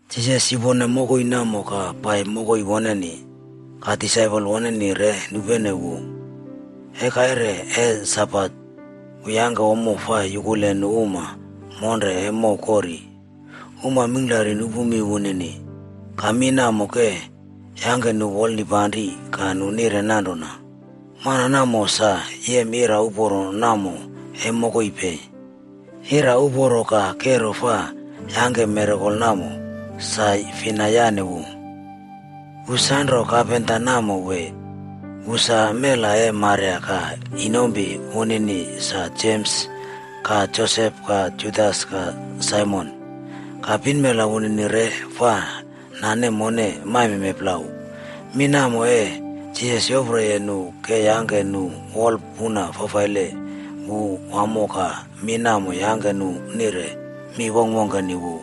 Jisas yupone mokoi namo ka pai mokoi woneni. Ka disaipol woneni re nupene wu. E kaire e Sabat, wu yangke ommo fa yukule nu uma monre e mow kori. Uma mingklari nupu mi wunini, ka mi namo ke yangke nu wolnipanri ka nu nire nanrona, “Mana namo sa yem ira uporo namo e mokoi pei? Ira uporo ka kero fa yangke mirakel namo, sa fina yane wu? Wu sa nro kapenta namo wee? Wu sa mela e Maria ka inompi wunini sa, Jems ka Josep ka Judas ka Saimon. Ka pinmela wunini re fa nane mone maimeme plau.” Mi namo e Jisas yoproye nu ke yangke nu wolpuna fafaile wu wamo ka mi namo yangke nu nire mi wongkwongkeni wu.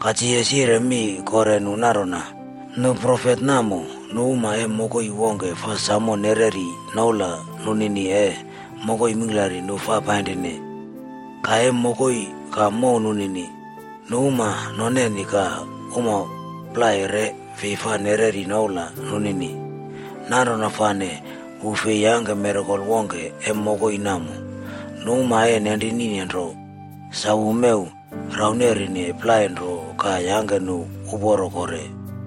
Ka Jisas yire mi kore nu nanrona, “Nu profet namo, nu uma e mokoi wongke fa samo nereri noula nunini e mokoi mingklari nu fa painrine. Ka, e mokoi ka mow nunini, nu uma noneni ka uma plai re fi fa nereri noula nunini.” Nanrona fane wu fi yangke mirakel wongke e mokoi namo. Nu uma e nenrinine nro, sa wu mew rauneri plai nro ka yangke nu uporo kore.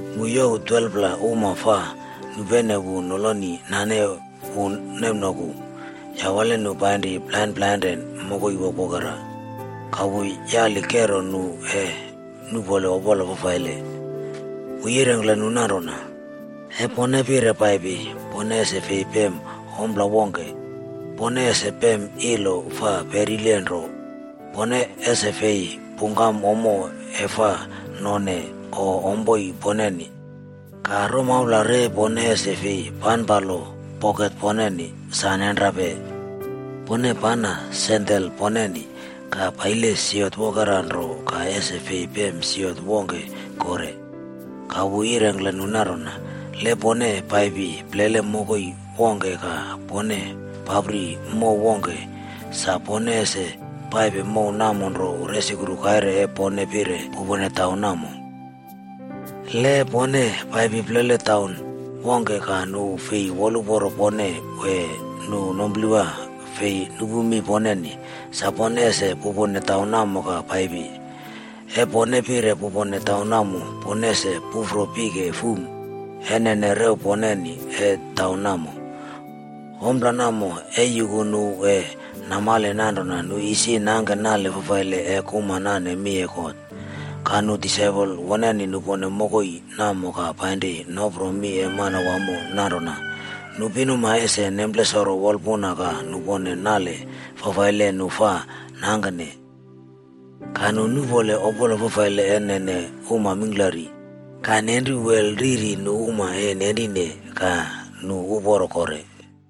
Wu youw 12pla uma fa nupenene wu noloni nane wu nemnoku, yawale nu painri plainre plainre mokoi wokwokera. Ka wu yali kero nu e nuꞌpole opola fafaile. Wu yirengkle nu nanrona, “E pone pire paipi, pone ese fi pem ompla wongke. Pone ese pem ilo fa perile nro. Pone ese fi pungkam ommo e fa none o ompoi poneni. Ka romaula re pone ese fi panpalo poket poneni. Sa nenrape! Pone pana sandel poneni, ka paile siot wokera nro ka ese fi pem siot wongke kore.” Ka wu yirengkle nu nanrona, “Le pone paipi plele mokoi wongke ka pone papri mow wongke, sa pone ese paipe mow namo nro resukru kaire e pone pire pupone taun namo. Le e pone paipi plele taun wongke ka nu fi woluporo pone wee nu numplewa fi nupu mi poneni, sa pone ese pupone taun namo ka paipi. E pone pire pupone taun namo, pone ese pufro pike fuma e nene rew poneni e taun namo. Ompla namo ee yuku nu e namale nanrona nu isi nangke nale fafaile e kuma nane mi e God.” Ka nu disaipol woneni nupone mokoi namo ka painri nopro mi e Manawamo nanrona, nu pinuma ese nemplesoro wolpuna ka nupone nale fafaile nu fa nangkene. Ka nu nuꞌpole opola fafaile e nene uma mingklari, ka nenru wel riri nu uma e nenrinine ka nu uporo kore.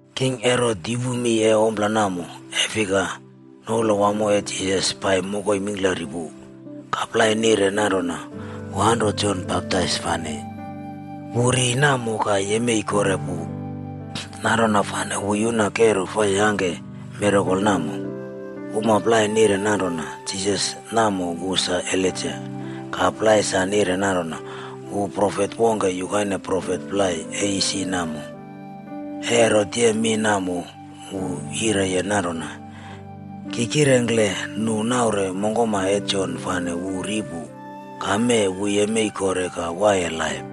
King Herot yupu mi e ompla namo, e fika, noula wamo e Jisas pai mokoi mingklari pu. Ka plai nire nanrona, “Wu anro Jon Baptais fane, wu ri namo ka yemei kore pu. Nanrona fane wu yuna kero fa yangke mirakol namo.” Uma plai nire nanrona, “Jisas namo wu sa Elaija.” Ka plai sa nire nanrona, “Wu profet wongke yukaine profet plai e isi namo.” E Herot yem mi namo, wu yireye nanrona, “Ki kirengkle nu naure mongkoma e Jon fane wu ri pu, ka mee wu yemei kore ka waiye laip!”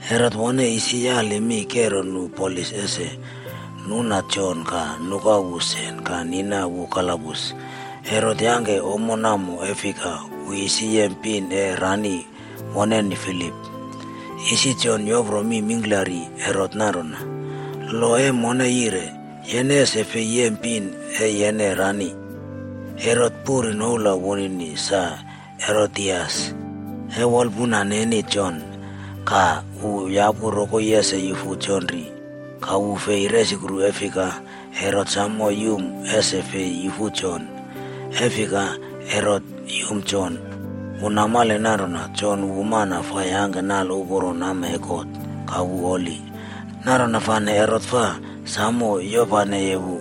Herot wone isi yali mi kero nu polis ese nuna Jon ka nuka wu sen ka nina wu kalabus. Herot yangke ommo namo e fika, wu isi yem pin e rani woneni Filip. Isi Jon yopro mi mingklari Herot nanrona, “Lo e mone yire, yene ese fi yem pin e yene rani.” Herot puri noula wunini sa Herodias, e wolpuna neni Jon, ka wu yapu rokoi ese yufu Jon ri. Ka wu fi resukru e fika, Herot samo yum ese fi yufu Jon. E fika, Herot yumye Jon. Wu namale nanrona Jon wu mana fa yangke nale uporo nama e God ka wu holi. Nanrona fane Herot fa samo yopaneye wu.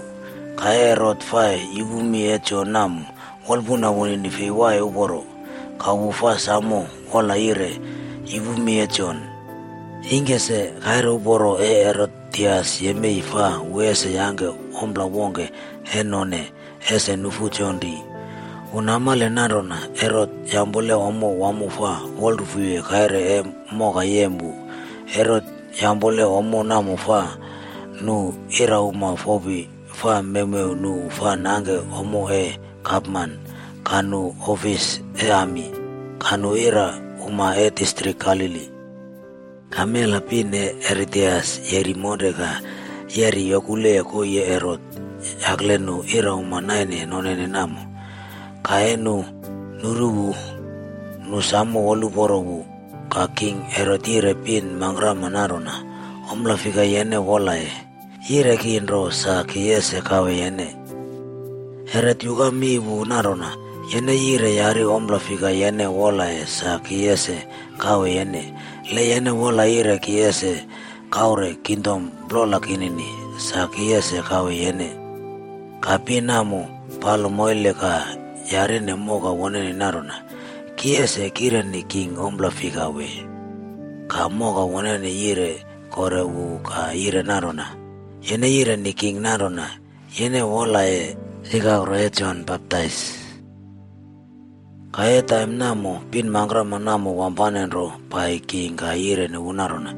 Ka e Herot fa yupu mi e Jon namo, wolpuna wunini fi waiye uporo. Ka wu fa samo wola yire yupu mi e Jon. Ingke se, kaire uporo e Herodias yemei fa wu ese yangke ompla wongke e none ese nufu Jon ri. Wu namale nanrona Herot yampole ommo wamo fa wolrufuye kaire e moka yem wu. Herot yampole ommo namo fa nu irauma fopi fa mewmew wu fa nangke ommo e gapman, ka nu opisa e ami, ka nu irauma e distrik Galili. Ka mela pin e Herodias yeri monre ka yeri yokuleye koii e Herot yakle nu irauma naine nonene namo. Ka e nu nuru wu, nu samo woluporo wu. Ka king Herot yire pin mangkrama nanrona, “Ompla fika yene wolaye, yire ki nro sa ki ese kawe yene.” Herot yuka mi wu nanrona, “Yene yire yari ompla fika yene wolaye sa ki ese kawe yene. Le yene wola yire ki ese kaure kingdom plola kinini, sa ki ese kawe yene.” Ka pin namo palo moile ka yarine moka woneni nanrona, “Ki ese kireni king ompla fika wee?” Ka moka woneni yire kore wu ka yire nanrona, “Yene yireni king nanrona yene wolaye ikakro e Jon Baptais.” Ka e taim namo, pin mangkrama namo wampane nro pai king ka yireni wu nanrona,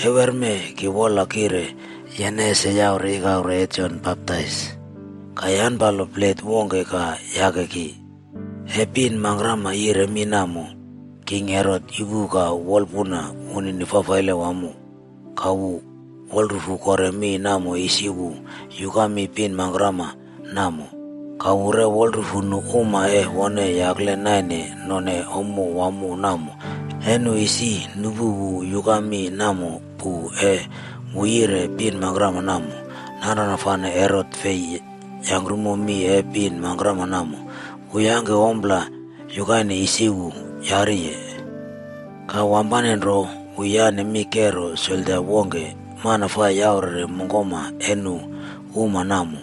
“Ewerme ki wola kire yene ese yaure ikakro e Jon Baptais ka yanpalo plet wongke ka yake ki.” E pin mangkrama yire mi namo, king Herot yupu ka wolpuna wunini fafaile wamo. Ka wu wolrufu kore mi namo isi wu yuka mi pin mangkrama namo, ka wu re wolrufu nu uma e wone yakle naine none ommo wamo namo e nu isi nupu wu yuka mi namo pu e wu yire pin mangkrama namo. Nanrona fane Herot fi yangkrumo mi e pin mangkrama namo. Wu yangke ompla yukaine isi wu yariye. Ka wampane nro wu yane mi kero soldia wongke, mana fa yaurere mongkoma e nu uma namo,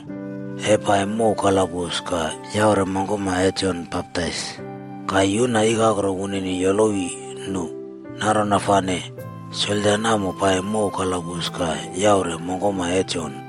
e pai mow kalabus ka yaure mongkoma e Jon Baptais ka yuna ikakro wunini yolowi nu. Nanrona fane soldia namo pai mow kalabus ka yaure mongkoma e Jon.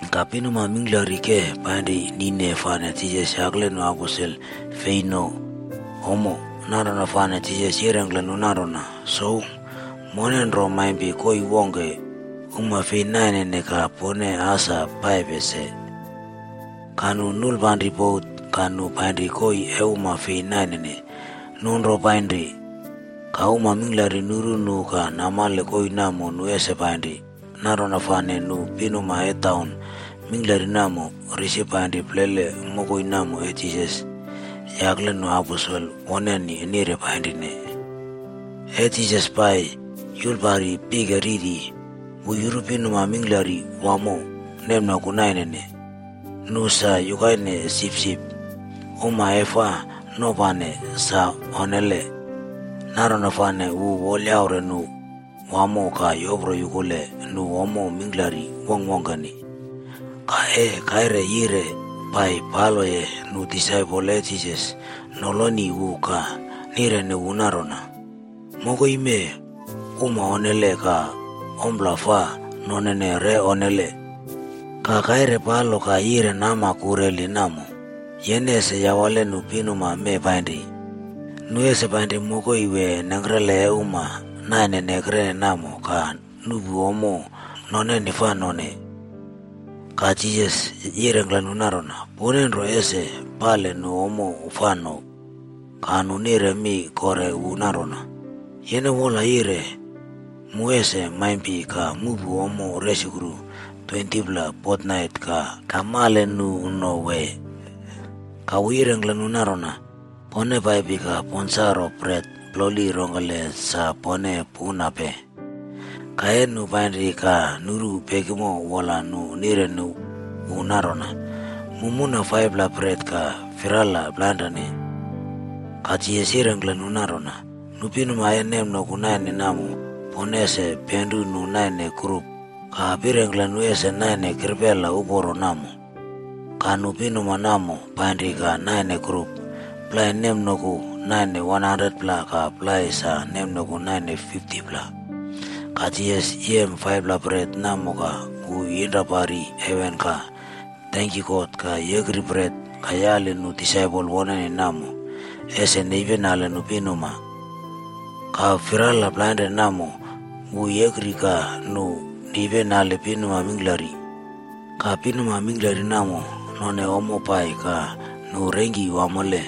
Ka pinuma mingklari ke painri nine fane Jisas yakle nu aposel fi no ommo. Nanrona fane Jisas yirengkle nu nanrona, “Sou, mone nro maimpi koii wongke uma fi nainene ka pone as pai se.” Ka nu nulpanri bot ka nu painri koii e uma fi nainene. Nu nro painri. Ka uma mingklari nuru nu ka namale koii namo nu ese painri. Nanrona fane nu pinuma e taun mingklari namo risi painri plele mokoi namo e Jisas yakle nu aposel woneni nire painrine. E Jisas pai yulpari pike riri, wu yuru pinuma mingklari wamo nemnoku nainene. Nu sa yukaine sipsip, uma e fa nopane sa onnele. Nanrona fane wu wolyaure nu wamo ka yopro yukuleye nu ommo mingklari wongkwongkeni. Ka e kaire yire pai paloye nu disaipol e Jisas noloni wu ka nireni wu nanrona, “Mokoi mee uma onnele ka ompla fa nonene re onnele. Ka kaire paipalo ka yire nama kureli namo. Yene ese yawale nu pinuma mee painri. Nu ese painri mokoi wee nengkrele e uma naine ekrene namo ka nuꞌpu ommo noneni fa no.” Ka Jisas yirengkle nu nanrona, “Pone nro ese pali nu ommo fa no.” Ka nu nire mi kore wu nanrona, “Yene wola yire mu ese maimpi ka muꞌpu ommo resukru 20pla fotnait ka male nu no wee?” Ka wu yirengkle nu nanrona, “Pone paipi ka ponsaro bret ploli rongkele sa pone punape.” Ka e nu painri ka nuru pekimo wola nu nireni wu nanrona, “Mu muna 5pla bret ka firala plainre.” Ka Jisas yirengkle nu nanrona, “Nu pinuma e nemnoku nainene namo pone ese penru nu naine grup, ka pirengkle nu ese naine kiprela uporo namo.” Ka nu pinuma namo painri ka naine grup. Plai nemnoku naine 100pla ka plai sa nemnoku naine 50pla. Ka Jisas yem 5pla bret namo ka wu yinra pari heven ka tenkyu God ka yekri bret ka yaliye nu disaipol woneni namo ese nepinali nu pinuma. Ka firala plainre namo, wu yekri ka nu nepinali pinuma mingklari. Ka pinuma mingklari namo none ommo pai ka nu rengki wamole.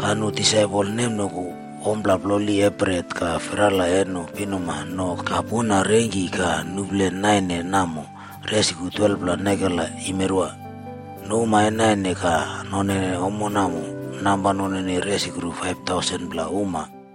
Ka nu disaipol nemnoku ommo ploli e bret ka firala e nu pinuma no ka puna reingki ka nuplen naine namo resukru 12pla nekela yimeri. Nu uma e naine ka nonene ommo namo namba nunini resukru 5,000pla uma.b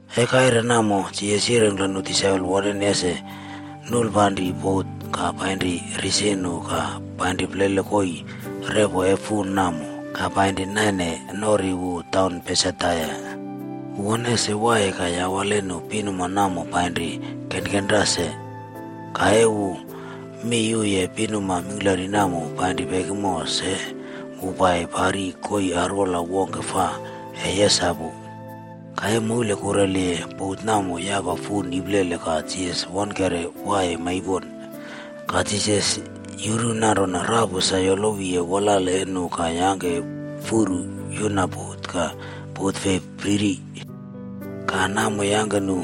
E kaire namo, Jisas yirengkle nu disaipol woneni ese nulpanri bot ka painri risi wu ka painri plele koii repo e fun namo ka painri naine norine wu taun Betsaida. Wu wone ese waiye ka yawale nu pinuma namo painri kenkenra se. Ka e wu miyuye pinuma mingklari namo painri pekimo se, wu pai pari koii arwola wongke fa e yesapu. Ka e moule kureliye, bot namo yapa fun iplele ka Jisas wonekere waiye maipon. Ka Jisas yuru nanrona rapu sa yolowiye wolale e nu ka yangke furu yuna bot ka bot fei priri. Ka namo yangke nu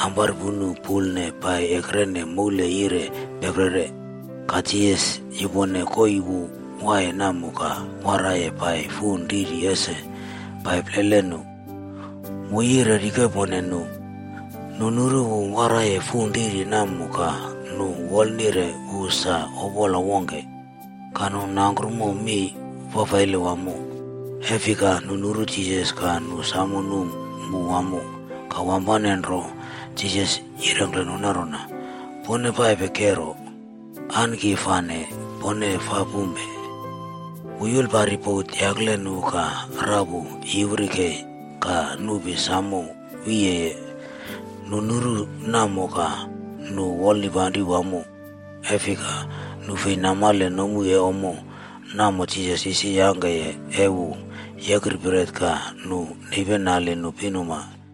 amparpunu pulne pai ekrene moule yire peprere. Ka Jisas yupone koii wu waiye namo ka waraiye pai fun riri ese pai plele nu. Wu yire rikepone nu. Nu nuru wu waraiye fun riri namo ka nu wolnire wu sa opola wongke, ka nu nangkromo mi fafaile wamo. E fika nu nuru Jisas ka nu samo num wu wamo. Ka wampane nro Jisas yirengkle nu nanrona, “Pone paipe kero! An ki fane pone fa pumpe.” Wu yulpari bot yakle nu ka rapu yiwri kei ka nupi samo wiyeye. Nu nuru namo ka nu wolnipanri wamo. E fika nu fi namale nomu e ommo namo Jisas isi yangke e wu yekri bret ka nu nepinali nu pinuma.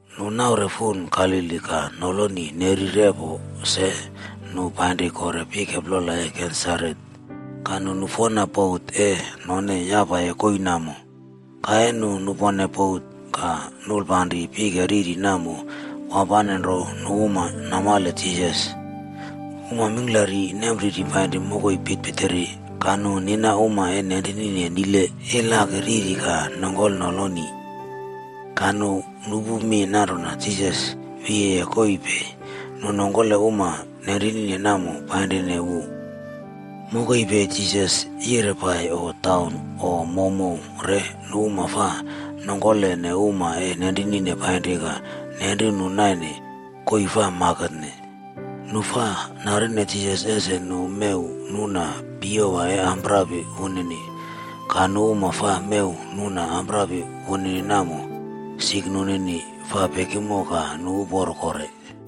Nu naure fun Galili ka noloni neri repo se, nu painri kore pike plola e Genesaret. Ka nu nufena bot e none yapaye koii namo. Ka e nu nupone bot ka nulpanri pike riri namo, wampane nro nu uma namale Jisas. Uma mingklari nempriri painri mokoi pitpitiri ka nu nina uma e nenrinine nile ilaki riri ka nongkole noloni. Ka nu nupu mi nanrona Jisas wiye koii pei, nu nongkole uma nenrinine namo painrine wu. Mokoi pei Jisas yire pai o taun o mowmow re nu uma fa nongkole uma e nenrinine painri ka nenru nu naine koii fa maketne. Nu fa narine Jisas ese nu mew nuna piyewa e amprapi wunini. Ka nu uma fa mew nuna amprapi wunini namo, sik nunini fa pekimo ka nu uporo kore.